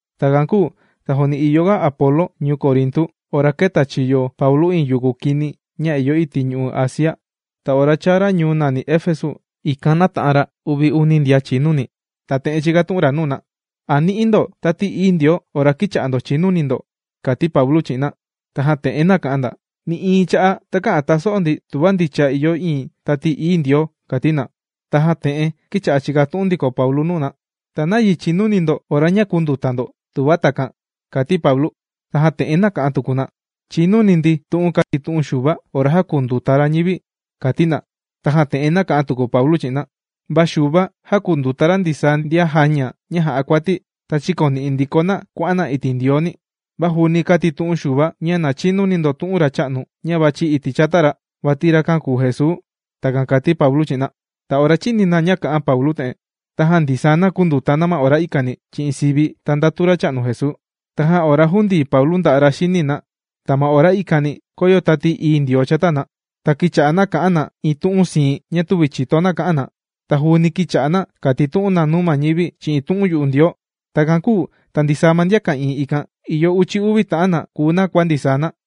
Takan kūu ta juuni ìyoga Apolo ñuu Corintu, ora kēta chiyo Paulu iin yuku kini ña ìyo iti' ñu'u' Asia. Ta ora chāa ra ñuu nàni Efesu ikan nāta'an ra uvi uni ndian chìnuni. Ta te'en chīkatu'un ra nuu na: ―¿A nī'i ndo Tati Ií Ndioo ora kīcha'a ndo chìnuni ndo? ―kàti Paulu chi'in na. Tajan te'en nāka'an na: ―Nï'iin cha'a' takä'an taso'o ndi tuva ndicha ìyo iin Tati Ií Ndioo ―kàti na. Tajan te'en kīcha'a chìkatu'un tuku Paulu nuu na: ―¿Ta nayi chīnuni ndo ora ña kūnduta ndo, tuva takan? ―kàti Paulu. Tajan te'en nāka'an tuku na: ―Chīnuni ndi tu'un kātitu'un Xuva ora jākunduta ra ñivi ―kàti na. Tajan te'en nāka'an tuku Paulu chi'in na: ―Va Xuva jākunduta ra ndisaa ndian jāña ña jà'a kuati, ta chīkoni'i ndiko na kuà'an na iti' Ndiooni. Va juuni kātitu'un Xuva nuu ndo ña na chinuni ndo tu'un ma Racha'nu ña vàchi iti' chata ra, vati rakan kùu Jesuu. ―Takan kàti Paulu chi'in na. Ta ora chīni na ña kā'an Paulu te'en, tajan ndisaa na kūnduta ma ora ikani chi'in sivi ta ndatu Racha'nu Jesuu. Tajan ora jūndii Paulu nda'a' ra xini na, ta ma ora ikani kōyo Tati Ií Ndioo chata na. Ta kīcha'a na kà'an na iin tu'un siin ña tüvi chìto na kà'an na. Ta juuni kīcha'a na kàtitu'un na nuu ma ñivi chi'in tu'un yu'u Ndioo. Takan kūu ta ndisaa ma ndian ka'ìin ikan, ìyo uchi uvi ta'an na kùu na kua ndisaa na.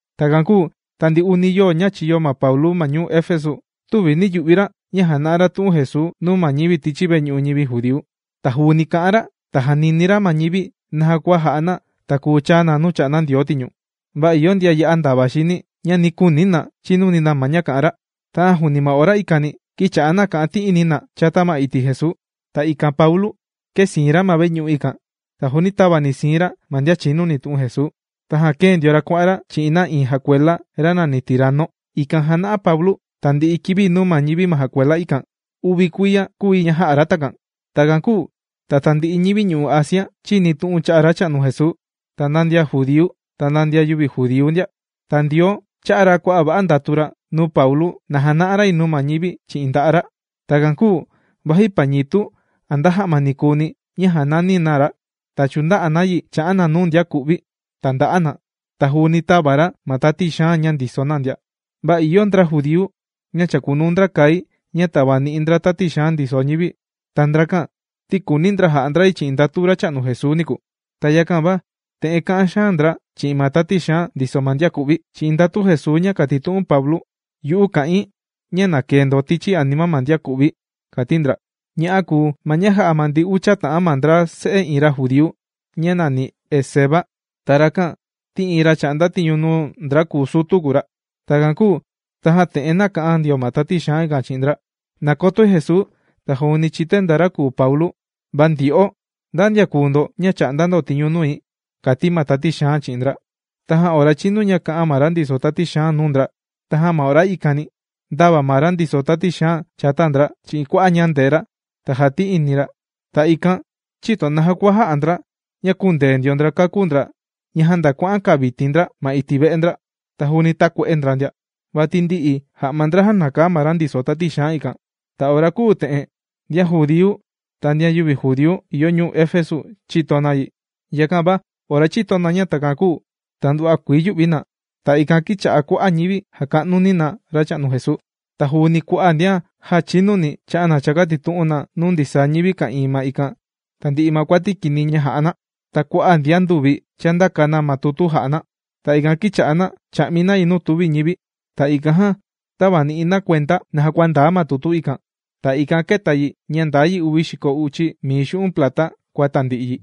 Takan kūu ta ndi uni yoo ña chīyo Paulu ma ñuu Efesu, tüvi nī yu'vi ra ña jàna'a ra tu'un Jesuu nuu ma ñivi tichi veñu'u ñivi judíu. Ta juuni kà'an ra ta jànini ra ma ñivi naja kua jà'a na ta kùu chaa na nuu chà'nda Ndioo tiñu. Va ìyo ndian ya'a ndava xini, ña nī kuuni na chinuni na ma ña kà'an ra. Tajan juuni ma ora ikani, kīcha'a na kà'an ti'ini na chata ma iti' Jesuu. Ta ikan Paulu kēsiin ra ma veñu'u ikan ta juuni tava ni siin ra ma ndian chinuni tu'un Jesuu. Tajan kēe ndio na kuà'an na chi'in ra iin jakuela ra nàni Tirano. Ikan jàna'a Paulu tandi'i kivi nuu ma ñivi ma jakuela ikan. Uvi kuiya kūu yi ña jā'a ra takan. Takan kūu ta tandi'i ñivi ñu'u' Asia chīni tu'un cha'a' Racha'nu Jesuu, ta nda ndian judíu ta nda ndian yüvi judíu ndia. Ta Ndioo chā'a ra kua'a' va'a ndatu ra nuu Paulu na jana'a ra yi nuu ñivi chi'in nda'a' ra. Takan kūu vaji pañitu a nda ja'ma ni kùuni ña jànani na ra, ta chùnda'a na yi chà'an na nuu ndian ku'vi, ta ndà'a na. Ta juuni tàva ra ma tati xaan ña ndiso na ndia. Va ìyo ndra judíu ña chàkunuu kai ña tàvani'i ndra tati xaan ndiso ñivi. Ta ndrakan ti kùuni ndra ja'a ndra yi chi'in ndatu Racha'nu Jesuu niku. Ta yakan va te'en kà'an xaan ndra chi'in ma tati xaan ndiso ma ndian ku'vi: ―¡Chi'in ndatu Jesuu ña kàtitu'un Paulu, yu'u, kà'in ña na kee ndo tichi anima ma ndian kù'vi! ―kàti ndra. Ña'a kùu ma ña jā'a ma ndi ucha ta'an ndra se'e iin ra judíu ña nàni Esceva. Ta rakan ti iin ra chà'nda tiñu nuu ndra kùu sutu kùu ra. Takan kūu tajan te'en nāka'an ndio ma tati xaan ikan chi'in ndra: ―Nàkotoi Jesuu, ta juuni chìtoi nda ra kùu Paulu, ¿va ndyo'o nda ndian kùu ndo ña chà'nda ndo tiñu nui? ―kàti ma tati xaan chi'in ndra. Tajan ora chīnu kā'an ma ra ndiso tati xaan nuu ndra, tajan ma ora ikani, ndāva ma ra ndiso tati xaan chata ndra chi'in kua'a' ñandee ra ta jāti'ini yi chi'in ndra, ta ikan chïto naja kua jā'a ndra ña kūndee ndio ndra kakú ndra ña janda kuà'an kaviti ndra ma iti' ve'e ndra, ta juuni tākue'e ndra ndia. Vati ndi'i ja'ma ndra jānakaa ma ra ndiso tati xaan ikan. Ta ora kūu te'en, ndian judíu ta ndian yüvi judíu ìyo ñuu Efesu chīto na yi. Yakan va ora chīto na ña takan kūu, ta ndava yū'vi na. Ta ikan kīcha'a kua'a' ñivi jàka'nu na Racha'nu Jesuu. Ta juuni kua'a' ndian já chīnuni chà'an na chàkatitu'un na nuu ndisaa ñivi ka'ìin ma ikan tandi'i ma kuati kini ña jà'a na. Ta kua'a' ndian nduvi chàndaka na ma tutu jà'a na. Ta ikan kīcha'a na chà'mi na yi nuu tùvi ñivi. Ta ikan tāvani'i na kuenda naja kua ndaa ma tutu ikan. Ta ikan kēta yi ña ndaa yi uvi xiko uchi mii xu'un' plata kua tandi'i yi.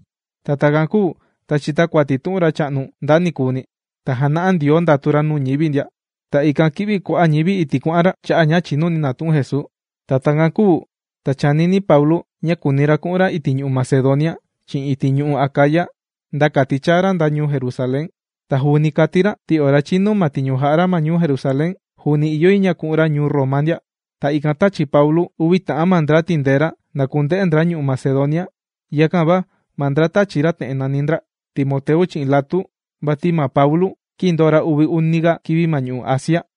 Ta takan kūu ta chìta kuati tu'un Racha'nu Jesuu nda nikuuni, ta jàna'a Ndioo ndatu ra nuu ñivi ndia. Ta ikan kī'vi kua'a' ñivi iti' kuà'an ra, cha'a ña chìnuni na tu'un Jesuu. Ta takan kūu ta chànini Paulu, ña kùuni ra ku'un ra iti' ñu'u' Macedonia chi'in iti' ñu'u' Acaya, nda kati chāa ra nda ñuu Jerusalén. Ta juuni kàti ra, ti ora chinu ma tiñu jà'a ra ñuu Jerusalén, juuni ìyo yi ña ku'un ra ñuu Roma ndia. Ta ikan tāchi Paulu uvi ta'an ma ndra tìndee ra na ku'un ndra ñu'u' Macedonia. Yakan va ma ndra tāchi ra te'en nàni ndra: Timoteu chi'in Latu. Vati ma Paulu, kīndoo ra uvi uniga kivi ma ñu'u' Asia.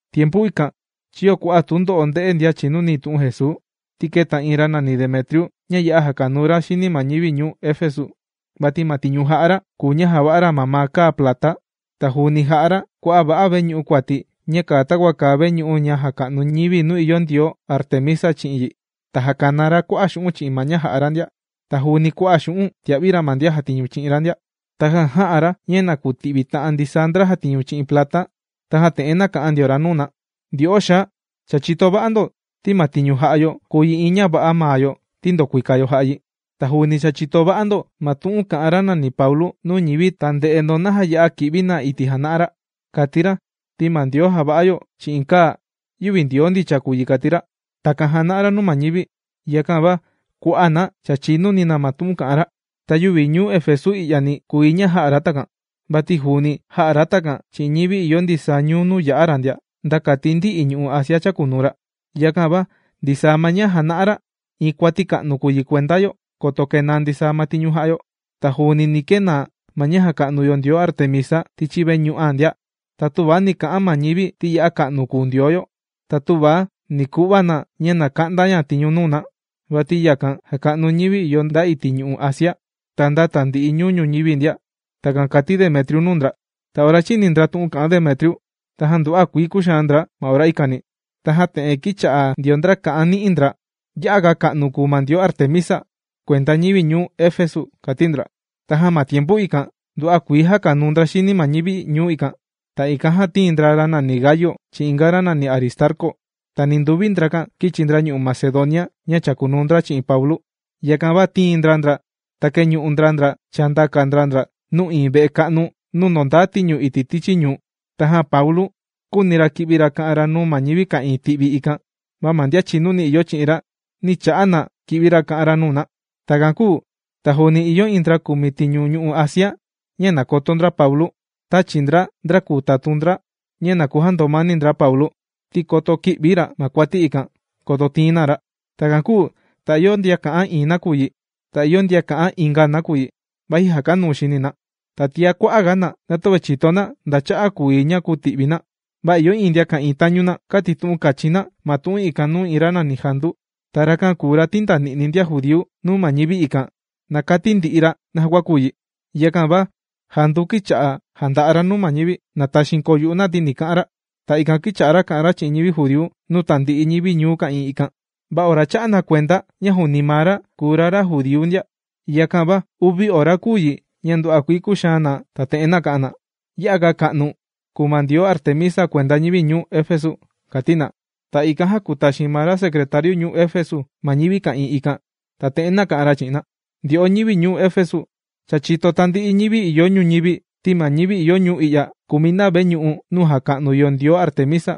Tiempu ikan chīyo kua'a' tundo'o ndē'e ndian chìnuni tu'un Jesuu, ti kēta iin ra nàni Demetriu ña ya'a jàkanuu ra xini ma ñivi ñuu Efesu. Vati ma tiñu jà'a ra, kùu ña jàva'a ra mamaa kaa plata. Ta juuni jà'a ra kua'a' va'a veñu'u kuati ña kàa takua kàa veñu'u ña jàka'nu ñivi nuu ìyo ndioo Artemisa chi'in yi. Ta jàkanaa ra kua'a' xu'un' chi'in ma ña jà'a ra ndia. Ta juuni kua'a' xu'un' tìa'vi ra ma ndian jàtiñu chi'in ra. Tajan jā'a ra ña na kuti'vi ta'an ndisaa ndra jàtiñu chi'in plata. Tajan te'en nāka'an ndio ra nuu na: ―Ndyo'o xaa, cha chìto va'a ndo, ti ma tiñu jà'a yo kùu yi iin ña va'a maa yo ti ndòkuika yo jà'a yi. Ta juuni cha chìto ndo ma tu'un kà'an ra nàni Paulu nuu ñivi ta ndè'e ndo naja ya'a kì'vi na iti' jàna'a ra. Kàti ra ti ma ndioo jàva'a yo chi'in kaa yüvi ndioo ndicha kùu yi kàti ra. Takan jàna'a ra nuu ma ñivi. Yakan va kua'a' na cha chìnuni ma tu'un kà'an ra. Ta yüvi ñuu Efesu i'yani kùu yi ña jā'a ra takan, vati juuni jā'a ra takan chi'in ñivi ìyo ndisaa ñuu nuu yā'a ra ndia, nda kati ndi'i ñu'u' Asia chàkunuu ra. Yakan va ndisaa ma ña jàna'a ra, iin kuati ka'nu kùu yi kuenda yo, koto kenaa ndisaa ma tiñu jà'a yo. Ta juuni ni kenaa ma ña jàka'nu yo ndioo Artemisa tichi veñu'an ndia. Ta töva ni ka'an ma ñivi ti ya'a ka'nu kùu ndioo yo, ta tüva ni ku'va na ña na ka'nda ña tiñu nuu na. Vati yakan jàka'nu ñivi ìyo nda iti' ñu'u' Asia, ta nda tandi'i ñuu ñuñivi ndia. ―Takan kàti Demetriu nuu ndra. Ta ora chīni ndra tu'un kà'an Demetriu, tajan nduva'a kuii kūxaan ndra ma ora ikani. Tajan te'en kīcha'a ndio ndra kà'an ni'i ndra: ―¡Ya'a ga ka'nu kùu ma ndioo Artemisa, kuenda ñivi ñuu Efesu! ―kàti ndra. Tajan ma tiempu ikan, nduva'a kuii jàkanuu xini ndra ma ñuu ikan. Ta ikan jan tīin ndra ra nàni Gayu chi'in inga ra nàni Aristarcu. Ta ninduvi ndrakan kīchi ndra ñu'u' Macedonia ña chàkunuu ndra chi'in Paulu. Yakan va tīin ndra ndra, ta kēñu'u ndra ndra chāndaka ndra ndra nuu iin ve'e ka'nu nuu ndòndaa tiñu iti' tichi ñuu. Tajan Paulu kūuni ra ki'vi ra ka'an ra nuu ma ñivi ka'ìin ti'vi ikan. Va ma ndian chìnuni ìyo chi'in ra, nī cha'a na ki'vi ra kà'an ra nuu na. Takan kūu ta juuni ìyo iin ndra kùmi tiñu ñu'u' Asia ña nàkoto ndra Paulu, tāchi ndra, ndra kùu tatun ndra ña na kujandomani ndra Paulu, ti koto ki'vi ra ma kuati ikan, koto tiin na ra. Takan kūu ta ìyo ndian kà'an iin nakuyi, ta ìyo ndian kà'an inga nakuyi, vati jàkanuu xini na. Ta tiá kua'a' ga na, na töve chìto na ndaa cha'a' kùu yi ña kùti'vi na. Va ìyo iin ndian ka'ìin tañu na, kātitu'un kachin na ma tu'un ikan nuu iin ra nàni Jandu. Ta rakan kùu ra tīndani'ni ndian judíu nuu ma ñivi ikan, na kati ndi'i ra naja kua kùu yi. Yakan va Jandu kīcha'a jànda'a ra nuu ma ñivi, na taxiin koo yu'u na ti ni ka'an ra. Ta ikan kīcha'a ra kà'an ra cha'a' ñivi judíu nuu tandi'i ñivi ñuu ka'ìin ma ikan. Va ora chā'a na kuenda ña juuni ma ra kùu ra, ra judíu ndia, yakan va uvi ora kūu yi ña nduva'a kuii kūxaan na, ta te'en nāka'an na: ―¡Ya'a ga ka'nu kùu ma ndioo Artemisa kuenda ma ñivi ñuu Efesu! ―kàti na. Ta ikan jākutaxin ma ra secretariu ñuu Efesu ma ñivi ka'ìin ikan. Ta te'en nāka'an ra chi'in na: ―Ndyo'o ñivi ñuu Efesu. Cha chìto tandi'i ñivi ìyo ñuñivi ti ma ñivi ìyo ñuu i'ya kùmi na veñu'u nuu jàka'nu yo ndioo Artemisa.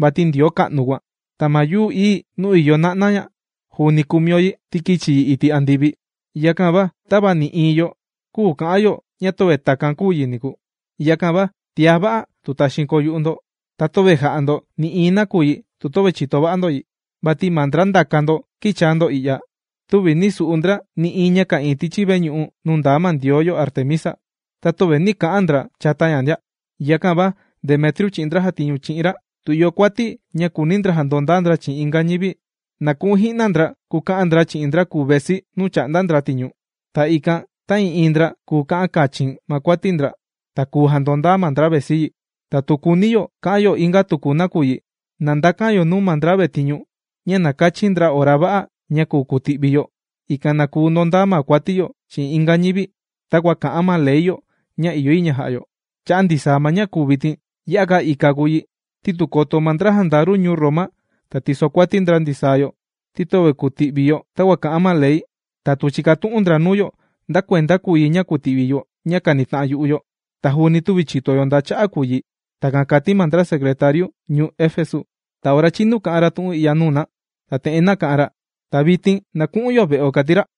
Vati ndioo ka'nu kùan, ta ma yuu ií nuu ìyo na'na ña juuni kùmi yo yi, ti kīchi yi iti' andivi. Yakan va tava nï'iin yo küu ka'an yo ña töve takan kūu yi niku. Yakan va tiá va'a tu taxiin koo yu'u ndo, ta töve jà'a ndo nï'iin nakuyi tu töve chìto va'a ndo yi. Vati ma ndra ndaka ndo kīchaa ndo i'ya, tüvi nī su'u ndra nï'iin ña ka'ìin tichi veñu'u nuu ndaa ma ndioo yo Artemisa, ta tüvi kà'an ti'ini ndra chata ña ndia. Yakan va tu Demetriu chi'in ndra jàtiñu chi'in ra, tu ìyo kuati ña kùuni ndra jandondaa ndra chi'in inga ñivi, na ku'un ji'na ndra kuka'an ndra yi chi'in ndra kùu vesi nuu chà'nda ndra tiñu. Ta ikan ta'ii'iin ndra kùu ka'an kachin ma kuati ndra, ta kùu jandondaa ma ndra vesi yi. Ta tu kùuni yo ka'an yo inga tuku nakuyi, na ndakan yo nuu ma ndra vetiñu ña na kachin ndra ora va'a ña kùu kuti'vi yo, ikan na kuu ndondaa ma kuati yo chi'in inga ñivi, takua kà'an ma ley yo ña ìyo yi ña ja'a yo. Cha'a' ndisaa ma ña kùu vitin, ya'a ga ika kùu yi ti tu koto ma ndra jandaru ñuu Roma ta tisokuati ndra ndisaa yo ti töve kùti'vi yo takua kà'an ma Ley, ta tu chikatu'un ndra nuu yo nda kuenda kùu yi ña kànita'an yu'u yo, ta juuni tüvi chìto yo nda cha'a' kùu yi. ―Takan kàti ma ra secretariu ñuu Efesu. Ta ora chīnu kā'an ra tu'un i'ya nuu na, ta te'en nāka'an ra: ―¡Ta vitin na ku'un yo ve'o! ―kàti ra.